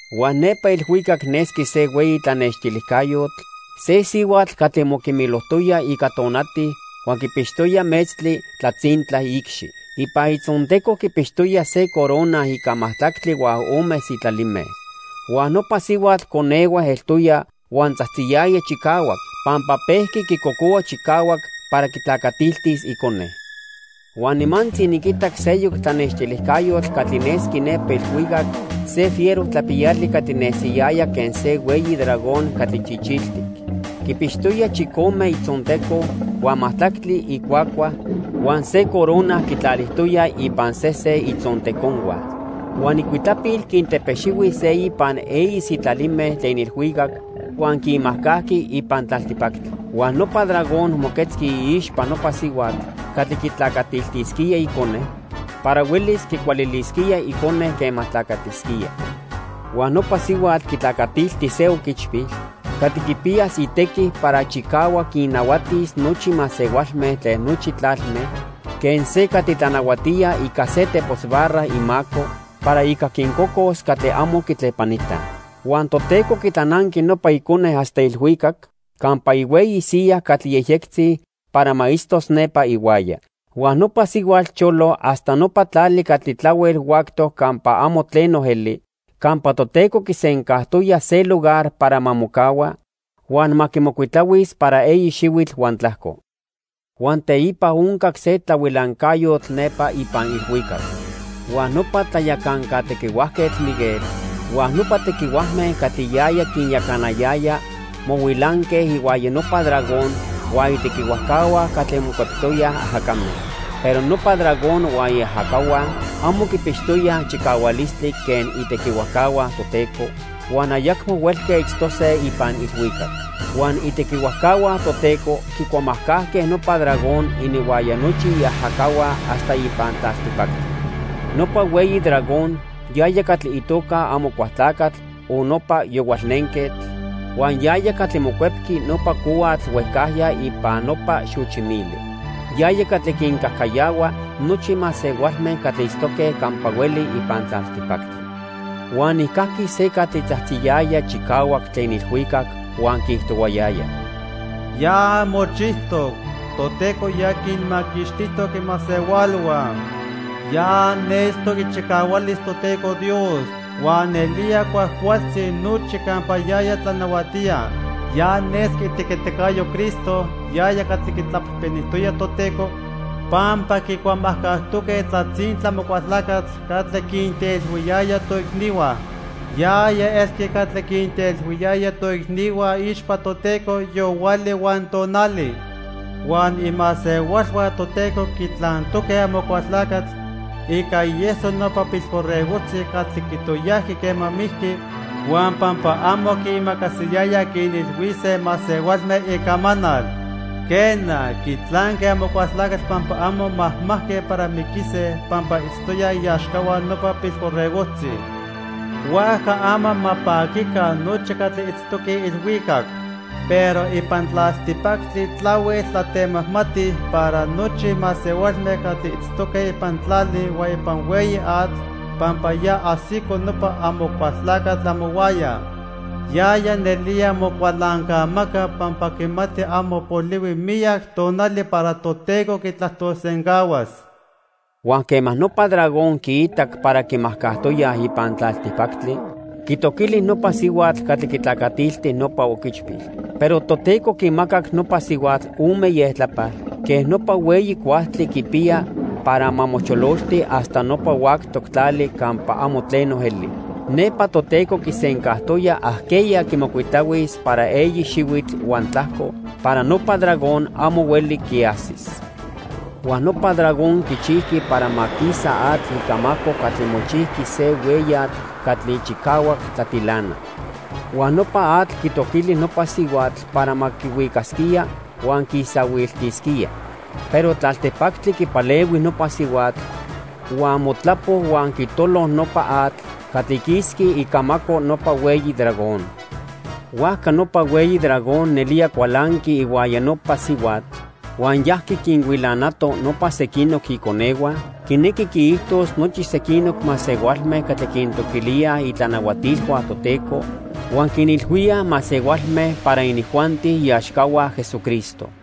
Huan nepa ilhuicac nesqui se hueyi tlanextilijcayotl, se sihuatl catli moquimilojtoya ica tonati huan quipixtoya metztli tlatzintla iicxi. Ipan itzonteco quipixtoya se corona ica majtlactli huan ome sitlalime. Huan nopa sihuatl conehue eltoya huan tzajtziyaya chicahuac pampa pejqui quicocohua chicahuac para quitlacatiltis icone. Huan nimantzi niquitac seyoc tlanextilijcayotl catli nesqui nepa ilhuicac, se fiero tlapiyali catli nesiyaya quen se hueyi dragón catli chichiltic. Quipixtoya chicome itzonteco, huan majtlactli icuacua, huan se corona quitlalijtoya ipan sesen itzonteconhua. Huan icuitlapil quintepexihui se ipan eyi sitlalime tlen ilhuicac huan quinmajcajqui ipan tlaltipactli. Huan nopa dragón moquetzqui iixpa nopa sihuatl catli quitlacatiltisquía icone para huelis quicualilisquía icone quema tlacatisquía. Huan nopa sihuatl quitlacatilti se oquichpil catli quipiyas itequi para chicahuac quinnahuatis nochi masehualme tlen nochi tlalme quen se catli tlanahuatía ica se tepos barra imaco para ica quincocos catli amo quitlepanitaj. Huan Toteco quitlananqui nopa icone hasta ilhuicac campa ihueyi siya catli yejyectzi para ma itztos nepa ihuaya. Huan nopa sihuatl cholo hasta nopa tlali catli tlahuel huactoc campa amo tleno eli campa Toteco quisencajtoya se lugar para ma mocahua huan ma quimocuitlahuis para eyi xihuitl huan tlajco. Huan teipa oncac se tlahuilancayotl nepa ipan ilhuicac. Huan nopa tlayacanca tequihuajquetl, Miguel, huan nopa tequihuajme catli yaya quinyacanayaya mohuilanque ihuaya nopa dragón huan itequihuajcahua catli mocueptoyaj ajacame. Pero nopa dragón huan iajacahua amo quipixtoyaj chicahualistli quen itequihuajcahua Toteco huan ayacmo huelque itztose ipan ilhuicac. Huan itequihuajcahua Toteco quicuamajcajque nopa dragón ininhuaya nochi iajacahua hasta ipan tlaltipactli. Nopa hueyi dragón, yaya catli itoca Amocualtlacatl o nopa Yohualnenquetl, huan yaya catli mocuepqui nopa cohuatl huejcajya ipan nopa xochi mili. Yaya catli quincajcayahua nochi masehualme catli itztoque campa hueli ipan tlaltipactli. Huan nijcajqui se catli tzajtziyaya chicahuac tlen ilhuicac huan quiijtohuayaya: "Ya mochijtoc. Toteco ya quinmaquixtijtoc imasehualhua. Ya nestoc ichicahualis Toteco Dios huan nelía cuajcualtzi nochi campa yaya tlanahuatía. Ya nesqui itequiticayo Cristo yaya catli quitlapejpenijtoya Toteco, pampa quicuamajcajtoque tlatzintla Amocualtlacatl catli quintelhuiyaya toicnihua. Yaya elqui catli quintelhuiyaya toicnihua iixpa Toteco yohuali huan tonali. Huan imasehualhua Toteco quitlantoque Amocualtlacatl ica ieso nopa Pilborregojtzi catli quitoyajqui quema mijqui, huan pampa amo quiimacasiyayaj quinilhuise masehualme icamanal. Quena, quitlanque Amocualtlacatl pampa amo majmajque para miquise pampa itztoyaj iaxcahua nopa Pilborregojtzi. Huajca ama ma paquica nochi catli itztoque ilhuicac. Pero ipan tlaltipactli tlahuel tlatemajmati para nochi masehualme catli itztoque ipan tlali huan ipan hueyi atl, pampa ya ajsico nopa Amocualtlacatl amohuaya. Yaya nelía mocualancamaca pampa quimati amo polihui miyac tonali para Toteco quitlajtolsencahuas." Huan quema nopa dragón quiitac para quimajcajtoyaj ipan tlaltipactli, quitoquili nopa sihuatl catli quitlacatilti nopa oquichpil. Pero Toteco quimacac nopa sihuatl ome ieltlapal quen nopa hueyi cuajtli quipiya para ma mochololti hasta nopa huactoc tlali campa amo tleno eli. Nepa Toteco quisencajtoya ajqueya quimocuitlahuis para eyi xihuitl huan tlajco para nopa dragón amo hueli quiajsis. Huan nopa dragón quichijqui para ma quisa atl icamaco catli mochijqui se hueyatl catli chicahuac tlatilana. Huan nopa atl quitoquili nopa sihuatl para ma quihuicasquía huan quiisahuiltisquía. Pero tlaltipactli quipalehui nopa sihuatl huan motlapo huan quitolo nopa atl catli quisqui icamaco nopa hueyi dragón. Huajca nopa hueyi dragón nelía cualanqui ihuaya nopa sihuatl huan yajqui quinhuilanato nopa sequinoc iconehua, quinequi quiijtos nochi sequinoc masehualme catli quintoquilíaj itlanahuatilhua Toteco huan quinilhuíaj masehualme para inijuanti iaxcahua Jesucristo.